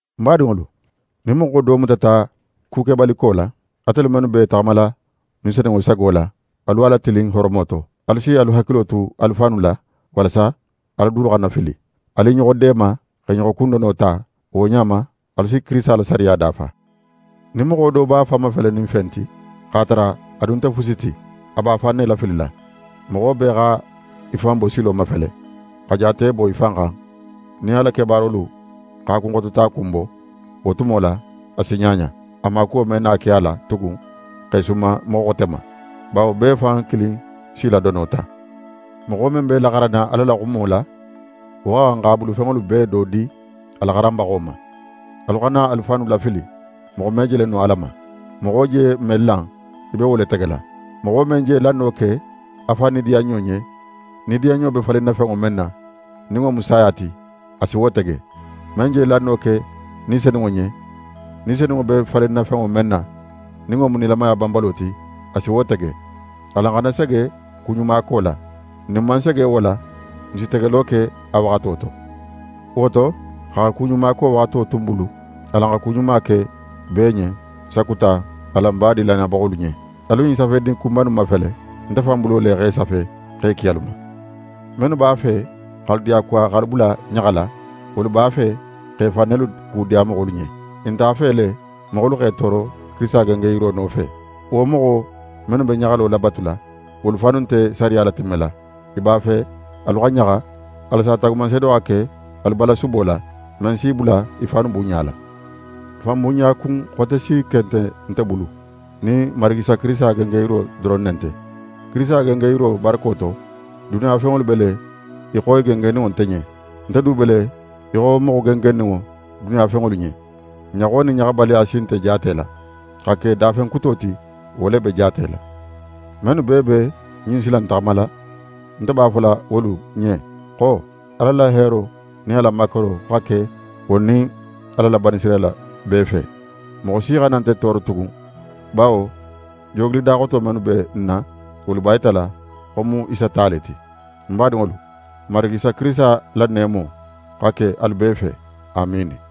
Ń badinŋolu, nin moxo do mutata kukebaliko la, atelu mennu b'e taxamala Ni Senunŋo sago la, alu a latilin horomo to. Alu si alu hakilo tu alu fannu la, walasa alu dulu xana fili. Alu i ɲoxo deema, x'e ɲoxo kundono ta; wo ɲa ma, alu si Kirisita la sariya dafa. Nin moxo do b'a fan mafelenin fen ti, x'a tara a dun nte fusi ti, a b'a fan ne lafilila. Moxo bee xa í fan bosilo mafele, xa jaate bo í fan xan; nin a la kebaarolu x'a kunxototakun bo, wo tumo la, a si ɲaɲa. A maakuwo me na ke a la tugun x'é suman moxo xote ma. Bawo bee fan kilin s'í la dono ta. Moxo men be laxaranna Ala la xumo la, wo xa xan x'a bulufenŋolu bee do di a laxaranbaxo ma. Alu xana alu fannu lafili; moxo me jele no Ala ma. Moxo je men lan, í be wo le tegela. Moxo men je lanno ke a fan nidiyanɲo ɲen, nidiyanɲo be falinna fenŋo men na, nin wo mu saya ti, a si wo tege. Men je lanno ke Ni Senunŋo ɲen, Ni Senunŋo be falinna fenŋo men na, nin wo mu nilamaya banbalo ti, a si wo tege. Alan xana sege kuɲumako la. Nin n man sege wo la, n si tegelo ke a waxato to. Wo to, xa kuɲumako waxato tu n bulu, alan xa ku ɲuma ke bee ɲen; sakuta alan badin lannayabaxolu ɲen. Alu ɲin safedin kunba innu mafele! Nte fan bulo le x'e safe, x'e ki alu ma. Mennu b'a fe x'alu diyakuwa x'alu bula ɲaxala, wolu b'a fe x'e fan nelu kudiya moxolu ɲen. I nte a fe le moxolu x'e tooro Kirisita gengenyiro nofe. Wo moxo mennu be ɲaxalo labatula, wolu fannu nte sariya latimmela. I b'a fe alu xa ɲaxa, walasa taagumanseedo xa ke alu balasubo la, men si i bula i fannu bunɲala. Fanbunɲa kun xote si ken nte nte bulu, nin n Marigi Isa Kirisita gengenyiro doron ne nte. Kirisita gengenyiro barako to, duniya fenŋolu be le í xo i gengenninŋo nte ɲen, nte du be le í xo moxo gengenninŋo duniya fenŋolu ɲen. Ɲaxo nin ɲaxabaliya si nte jaatela; xa ke dafen kuto ti, wo le be jaatela. Mennu bee be ɲin sila in taxamala, nte b'a fola wolu ɲen xo: Ala la heero nin a la makaro xa ke wolu nin Ala la Banisirayila bee fe. Moxo si xana nte tooro tugun; bawo joogilidaxoto mennu be ń na, wolu b'a yitala xo ń mu Isa ta le ti. Ń badinŋolu, n Marigi Isa Kirisita la neemo xa ke alu bee fe. Amiini.